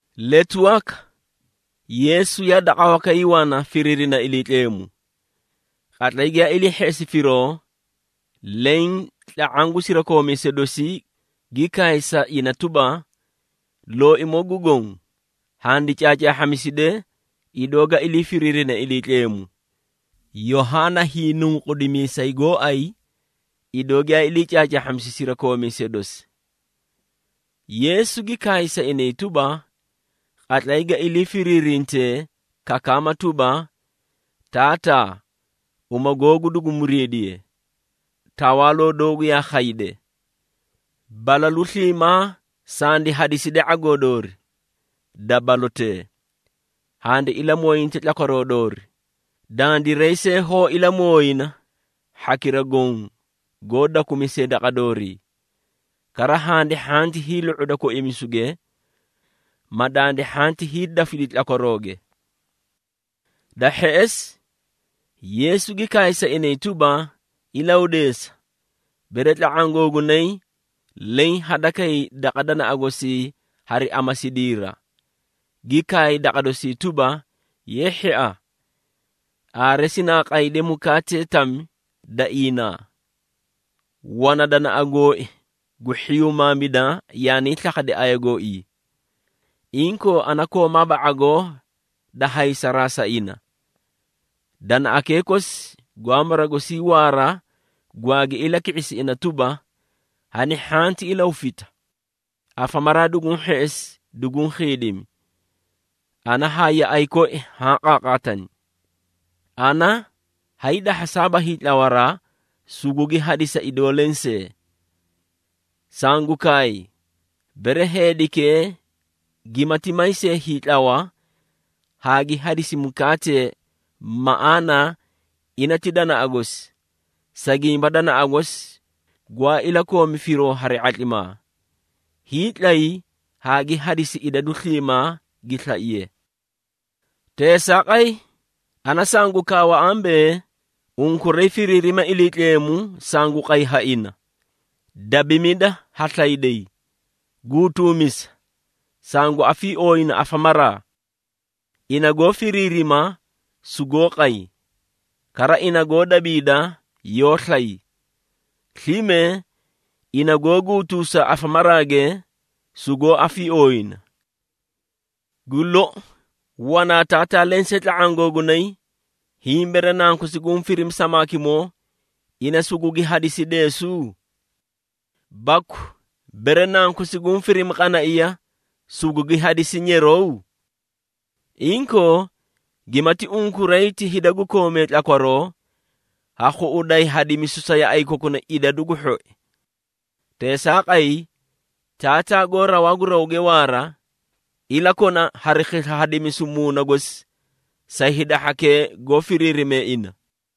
Letu waka, Yeesu yaa daqa wakay wana firiirina Iliitleemu. Qatlay giyaa ilii hheꞌesi firoo, leẽ tla⁄aã gu sirakoomiisee dosii gi kaay sa ina tuba, “Looimoo gu Goõ, handi caacaahhamiside, idoo ga ilii firiirine Iliitleemu, Yohaana Hiinunqudimiisay gooay, idoo giyaa ilii caacaahhamisi sirakoomiisee dosi.” Yeesu gi kaay sa inay tuba, “Qatlay ga ilii firiirintee kakaama tuba, ‘Taataa, uma googu dugu muriidiye. Tawaaloo doogu yaa khayde. Balalu sliimaa sandi hadiside ⁄agoo doori, da balotee. Handi ilamooyinte tlakwaroo doori, dandiray see hoó ilamooyina, hhakira goõ goó dakumisee daqa doori. Kara handi hhanti hiilu⁄uda koimisuge, ma dandi hhanti hiidafidi tlakwarooge.’” Da hheꞌesi, Yeesu gi kaay sa inay tuba, “Ilahudeesa, bere tla⁄aã googunay, leẽ hadakay daqa danaꞌa gosii hari amasidiira, gi kaay daqa dosii tuba, ‘Ye hhia! Aare sinaa qayde mukaatee tami da iinaa. Wana danaꞌa gooi gu hhiyumaamida yaanii slakhadi aya gooii. Inkoo ana koomaaba ⁄agoo da haysaraa sa ina.’ Danaꞌakee kosi gwaa mara gosii waara gwaagi ilaki⁄isi ina tuba, ‘Hani hhanti ilahufita! Afamaraa duguũ hheꞌesi, duguũ khiidimi! Ana haa yaꞌay koi haã qaaqaatani. Ana hayii dahhasaaba hiitlawaraa, sugugi hadisa idoo lensee!’ Sangu kaay, bere heedikee gimati may see hiitlawa, haa gi hadisi mukaatee maꞌaana ina ti danaꞌa gosi, sa gimba danaꞌa gosi gwaa ilakoomi firoo hari ⁄atlimaa, hiitlay haa gi hadisi idadu sliimaa gi slaiye. Teesaaqay, ana sangu kaawa ambee, ‘Unkuray firiirima Iliitleemu sangu qay ha ina, dabimida ha slayday, guutuumisa, sangu afiiooyina afamaraa.’ Ina goó firiirima, sugoó qay. Kara ina goó dabiida, yoó slay. Slime ina goó guutuusa afamaraage, sugoó afiiooyina. Gu lou, wanaa taataa lensee tla⁄aã googunay, hiĩ bere nankosi guũ firimi samaakimoo, ina sugugi hadisi deesu? Baku, bere nankosi guũ firimi qanaiya, sugugi hadisi nyeraw? Inkoo, gimati unkuray ti hida gu koomee tlakwaroo, ha khuꞌuday hadimisu sa yaꞌay kokuna idadu gu hhoi. Teesaaqay, Taataa goó rawaa gu rawge waara, ilakona hari khisla hadimisu Muuna gosi sa hida hhakee goó firiirime ina.”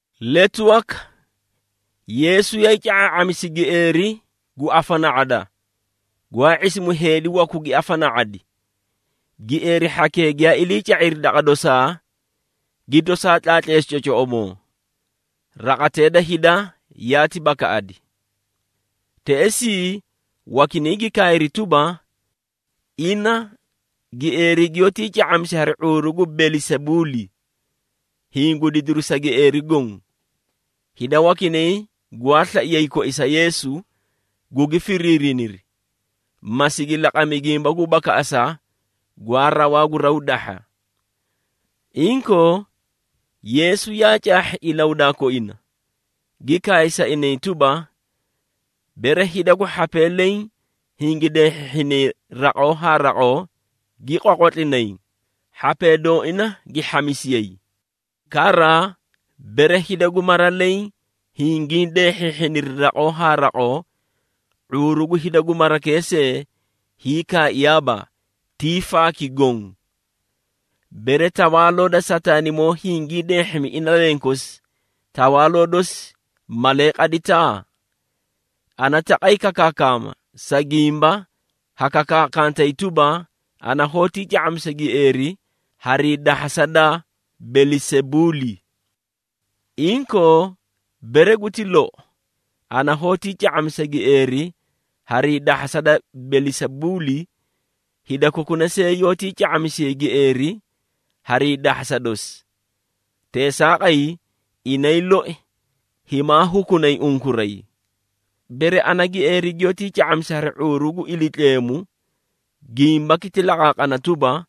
Letu waka, Yeesu yaay ca⁄aa⁄amisi gieeri gu afana⁄ada, gwaa ⁄isimu heedi wakuu gi afana⁄adi. Gieeri hhakee giyaa ilii ca⁄iri daqa dosaa, gi tosaa tlaatleesi cocoꞌomoo. Raqatee da hida yaati bakaꞌadi. Teꞌesii, wakinay gi kaayri tuba, “Ina, gieeri giyoótii ca⁄amisi hari ⁄uuru gu Belisebuuli, hiĩ gu didiri sa gieeri goõ!” Hida wakinay gwaa slaiyay koisa Yeesu, gugi firiniri, ma sigi laqami gimba gu bakaꞌasa gwaa rawaa gu raw dahha. Inkoo, Yeesu yaa caahhi ilahudaa koina, gi kaay sa inay tuba, “Bere hida gu hhapee leẽ hingi deehhiniri raqoo haa raqoo, gi qwaqwatlinay, hhapee dooina gi hhamisiyay. Kara, bere hida gu mara leẽ hingii deehhiihhiniri raqoo haa raqoo, ⁄uuru gu hida gu marakee see hiikaaiyaaba, ti faaki goõ. Bere tawaaloo da Sataanimoo hingi deehhimi ina lenkosi, tawaaloo dosi malee qadita? Ana taqay kakaakama, sa gimba ha kakaakantay tuba, ana hoótii ca⁄amisa gieeri harii dahhasa da Belisebuuli! Inkoo, bere guti lou, ana hoótii ca⁄amisa gieeri harii dahhasa da Belisebuuli, hida kokuna see yoótii ca⁄amisiyay gieeri hari hiidahhasa dosi! Teesaaqay, inay loi himaa hukunay unkuray. Bere ana gieeri giyoótii ca⁄amisa hari ⁄uuru gu Iliitleemu, gimbaki ti laqaaqana tuba,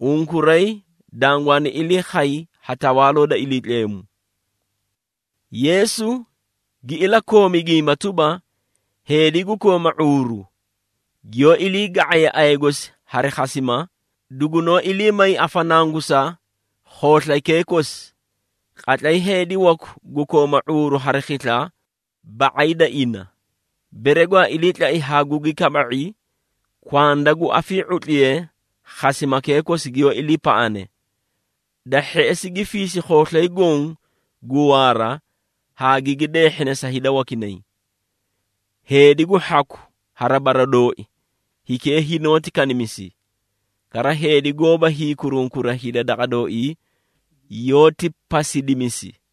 unkuray dangwaani ilii khay ha Tawaaloo da Iliitleemu.” Yeesu gi ilakoomi gimba tuba, “Heedi gu kooma ⁄uuru, giyoó ilii ga⁄aye aya gosi hari khasima, dugunoó ilii may afanangusa khooslaykee kosi. Qatlay heedi waku gu kooma ⁄uuru hari khisla ba⁄ay da ina, bere gwaa iliitlai haa gugi kaba⁄i, kwanda gu afii⁄utliye khasimakee kosi giyoó iliipaꞌane. Da hheꞌesi, gi fiisi khooslay goõ gu waara, haa gigi deehhina sa hida wakinay. Heedi gu hhaku hari bara dooi, hikee hinoóti kanimisi. Kara heedi goóba hiikurunkura hida daqa dooii, yoóti pasidimisi.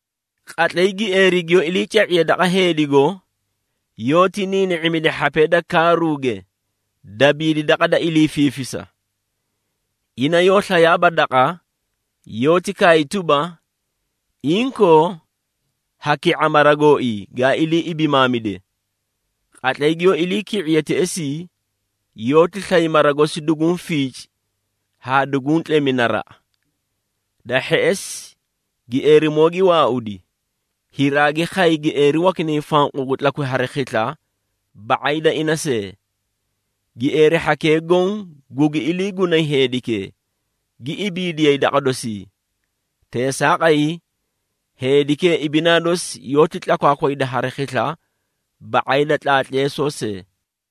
Qatlay gieeri giyoó ilii ca⁄iye daqa heedigo, yoóti niini⁄imidi hhapee da kaaruuge, dabiidi daqa da ilii fiifisa. Ina yoó slayaaba daqa, yoóti kaay tuba, ‘Inkoo, ha ki⁄a mara gooii, gaa ilii ibimaamide.’ Qatlay giyoó iliiki⁄iye teꞌesii, yoóti slay mara gosi duguũ fiici haa duguũ tlemi naraꞌa. Da hheꞌesi gieerimoo gi waaudi, hiraagi khay gieeri wakinay fanqu gu tlakwi hari khisla ba⁄ay da ina see. Gieeri hhakee goõ gugi iliigunay heedikee, gi ibiidiyay daqa dosii. Teesaaqay, heedikee ibinaa dosi yoóti tlakwaakwayda hari khisla ba⁄ay da tlaatleesoo see.”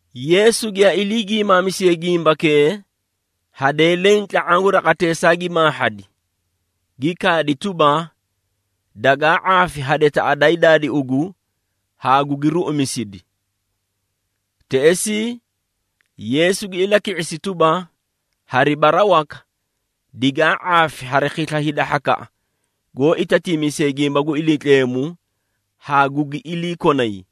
Yeesu giyaa ilii giimaamisiye gimbakee, hadee leẽ tla⁄aã gu raqateesaa gi maahhadi, gi kaadi tuba, “Dagaa ⁄aafi hadetaꞌa daay daadi ugu haa gugi ruꞌumisidi!” Teꞌesii Yeesu gi ilaki⁄isi tuba, “Hari bara waka, digaa ⁄aafi hari khisla hida hhakaꞌa goó itatiimisee gimba gu Iliitleemu haa gugi iliikonay!”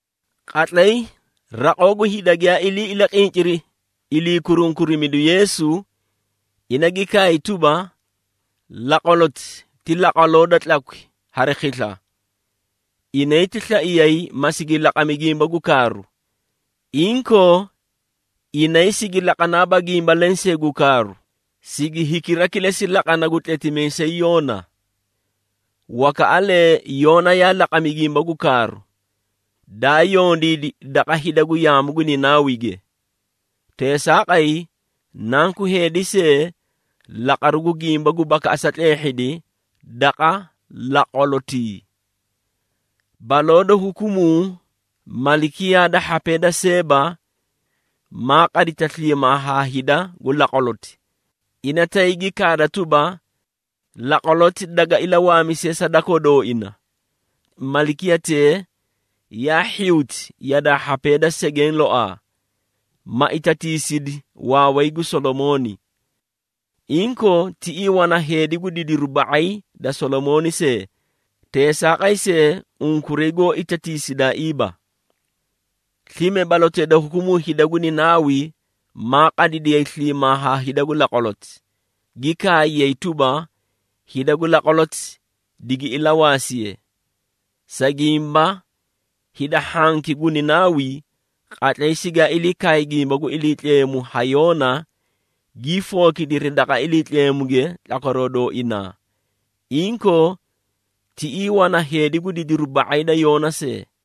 Qatlay raqoo gu hida giyaa ilii ilaqinciri ilii kurunkurida Yeesu, ina gi kaay tuba, “Laqwaloti ti laqwaloo da tlakwi hari khisla! Inay ti slaiyay, ma sigi laqami gimba gu kaaru. Inkoo, inay sigi laqanaaba gimba lensee gu kaaru, sigi hikira kilesi laqana gu tletimiisay Yoona.” Wakaꞌalee Yoona yaa laqami gimba gu kaaru, daa yondiidi daqa hida gu yaamu gu Ninaawige. Teesaaqay, Nanku Heedi see, laqaru gu gimba gu bakaꞌasa tleehhidi daqa laqwalotii. Baloo da hukumuu malikiyaa da hhapee da Seeba, maa qadita sliimaa haa hida gu laqwaloti, ina tay gi kaada tuba, laqwaloti daga ilawaamisiye sa dakoo dooina. Malikiyatee, yaa hhiyuti yadaa hhapee da segeẽ loaa, ma itatiisidi waaway gu Solomooni. Inkoo, tiꞌii wana heedi gu didiru ba⁄ay da Solomooni see, teesaaqay see unkuray goó itatiisidaaiiba! Slime balotee da hukumuu hida gu Ninaawi, maa qadidiyay sliimaa haa hida gu laqwaloti, gi kaayay tuba, hida gu laqwaloti digi ilawaasiye. Sa gimba hida hhanki gu Ninaawi, qatlay sigaa ilii kaay gimba gu Iliitleemu ha Yoona, gii fookidiri daqa Iliitleemuge tlakwaroo dooinaa! Inkoo, tiꞌii wana heedi gu didiru ba⁄ay da Yoona see!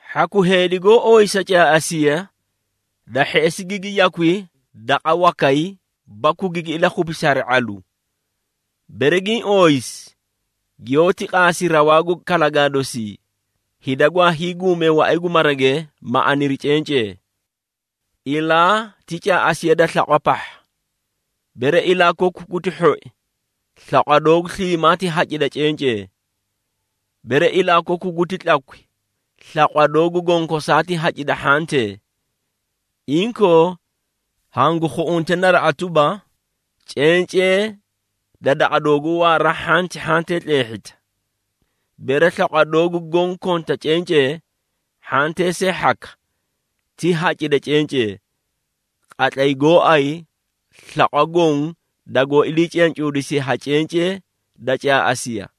Hhaku heedi goó ooyisa caaꞌasiya, da hheꞌesi gigi yakwi daqa wakay baku gigi ilakhupisi hari ⁄alu. Bere giĩ ooyisi, giyoóti qaasi rawaa gu kalagaa dosii, hida gwaa hiiguumee waꞌay gu marage, ma aniri cencee. Ilaa ti caaꞌasiya da slaqwa pahha. Bere ilaa koku guti hhoi, slaqwa doogu sliimaa ti hacida cencee. Bere ilaa koku guti tlakwi, slaqwa doogu gonkosaa ti hacida hhantee. Inkoo, hangu khuꞌunte naraꞌa tuba, cencee da daqa dooguu waara hhanti hhantee tleehhita! Bere slaqwa doogu goõ konta cencee, hhantee see hhaka, ti hacida cencee, qatlay gooay slaqwa goõ, dagoó ilii cencuudisiye ha cencee da caaꞌasiya.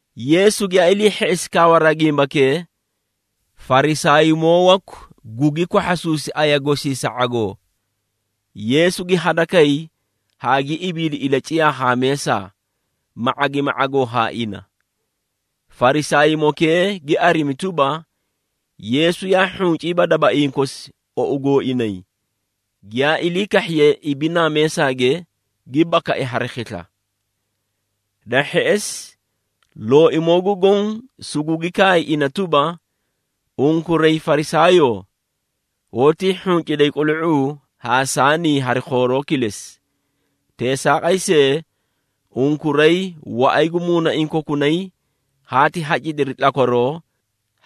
Yeesu giyaa ilii hheꞌesi kaawaraa gimbakee, Farisaaymoo waku gugi kwahhasuusi aya gosii sa ⁄agoo. Yeesu gi hadakay haa gi ibiidi ilaciyaa haa meesa, ma ⁄agimi ⁄agoo haa ina. Farisaaymokee gi arimi tuba, Yeesu yaa hhunciiba dabaiĩ kosi ou gooinay, giyaa ilii kahhiye ibinaa meesaage, gi bakai hari khisla. Da hheꞌesi, Looimoo gu Goõ sugugi kaay ina tuba, “Unkuray Farisaayoo, hoótii hhunciday qulu⁄uu haa saanii hari khooroo kilesi. Teesaaqay see, unkuray waꞌay gu muunaiĩ kokunay haati hacidiri tlakwaroo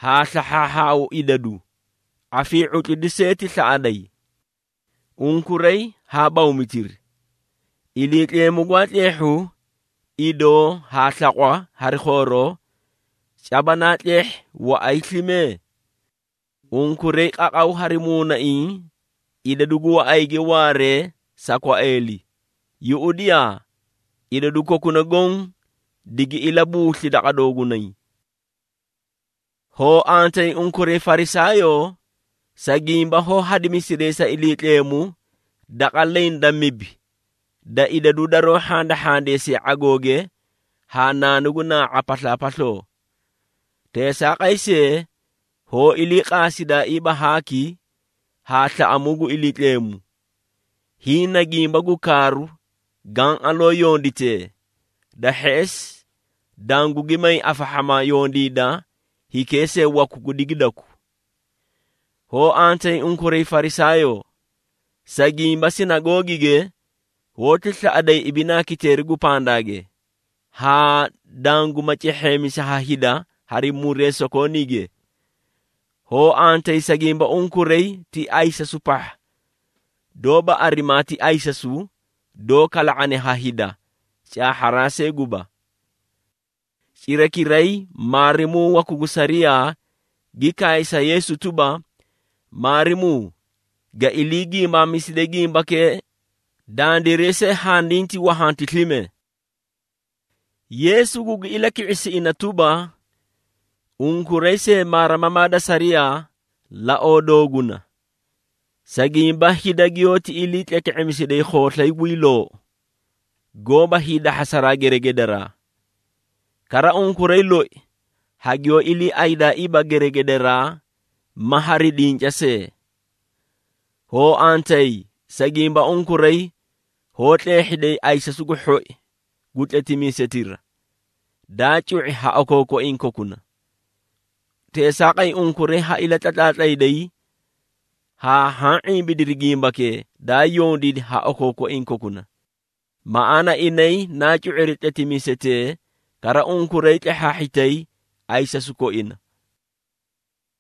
haa slahhaahhaau idadu, afii⁄utlidu see ti slaꞌaday. Unkuray haa bawmitiri! Iliitleemu gwaa tleehhu idoo haa slaqwa hari khooroo, caba naa tleehhi waꞌay slime? Unkuray qaqaw hari muunaiĩ idadu gu waꞌayge waaree sa kwaeeli, yuꞌudiyaa, idadu kokuna goõ digi ilabuusli daqa doogunay. Hoo antayi, unkuray Farisaayoo! Sa gimba hoó hadimisiday sa Iliitleemu daqa leẽ da mibi da idadu daroó hhandahhandeesiye ⁄agooge haa naanu gu naa⁄a paslaapasloo. Teesaaqay see, hoó iliiqaasidaaiiba haaki haa slaꞌamuu gu Iliitleemu! Hiĩ na gimba gu kaaru gaã aloo yonditee, da hheꞌesi dangugi may afahhama yondiida hikee see waku gu digidaku. Hoo antayi unkuray Farisaayoo! Sa gimba sinagoogige hoóti slaꞌaday ibinaa kiteeri gu pandaage, haa danguma cehheemisi ha hida hari muree sokooniige. Hoo antayi, sa gimba unkuray ti ayisasu pahha, doóba arimaa ti ayisasu, doó kala⁄ane ha hida, caahharaa see guba.” Cirakiray, maarimuu waku gu sariyaa, gi kaay sa Yeesu tuba, “Maarimuu, ga ilii giimaamiside gimbakee, dandiray see handiiti wahanti slime.” Yeesu gugi ilaki⁄isi ina tuba, “Unkuray see maarimamaa da sariyaa, Laoo dooguna, sa gimba hida giyoóti ilii tleke⁄emisiday khooslay guy loou, goóba hiidahhasaraa geregedaraa. Kara unkuray loi, hagiyoó iliiaydaaiiba geregedaraa ma hari dinca see! Hoo antayi, sa gimba unkuray hoó tleehhiday ayisasu gu hhoi gu tletimiisetira, daa cu⁄i ha okookoiĩ kokuna! Teesaaqay, unkuray ha ilatlatlaatlayday haa haã ⁄imbidiri gimbakee, daa yondiidi ha okookoiĩ kokuna. Maꞌaana inay naa cu⁄iri tletimiisetee, kara unkuray tlehhaahhitay ayisasu koina.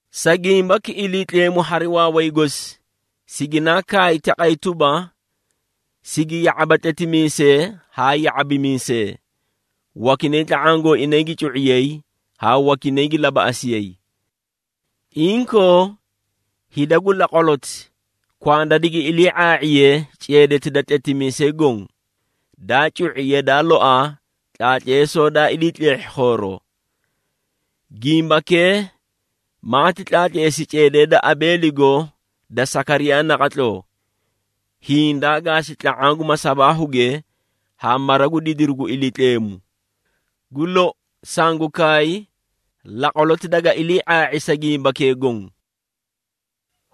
Sa gimbaki Iliitleemu hari waaway gosi siginaa kaay taqay tuba, ‘Sigi ya⁄aba tletimiisee haa ya⁄abimiisee, wakinay tla⁄aã gooinay gi cu⁄iyay haa wakinay gi labaꞌasiyay.’ Inkoo, hida gu laqwaloti, kwanda digi ilii ⁄aa⁄iye ceedeti da tletimiisee goõ, daa cu⁄i, yadaa loaa tlaatleesoo daa ilii tleehhi khooroo. Gimbakee, maati tlaatleesi ceedee da Abeeligo da Sakariyaa naqatloo, hiĩ daa gaasi tla⁄aã gu masabaahuge haa mara gu didiru gu Iliitleemu. Gu lou, sangu kaay laqwaloti daga ilii⁄aa⁄i sa gimbakee goõ.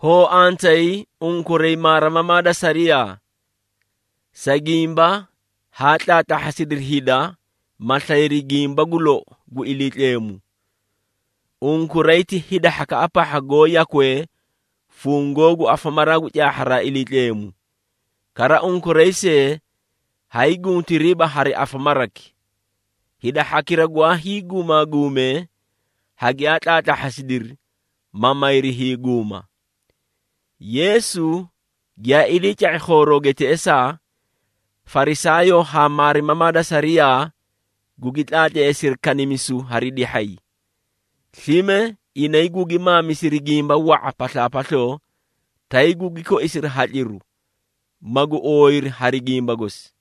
Hoo antayi, unkuray maarimamaa da sariyaa! Sa gimba haa tlaatlahhasidiri hida, ma slayri gimba gu lou gu Iliitleemu. Unkuray ti hida hhakaꞌa pahha goó yakwee fungoo gu afamaraa gu caahharaa Iliitleemu. Kara unkuray see hay guntiriiba hari afamaraki. Hida hhakira gwaa hiiguumaguume, hagiyaa tlaatlahhasidiri, ma mayri hiiguuma.” Yeesu giyaa iliica⁄i khoorooge teꞌesaa, Farisaayoo haa maarimamaa da sariyaa gugi tlaatleesiri kanimisu hari dihhay. Slime inay gugi maamisiri gimba wa⁄a paslaapasloo, tay gugi koisiri hatliru, magu ooyiri hari gimba gosi.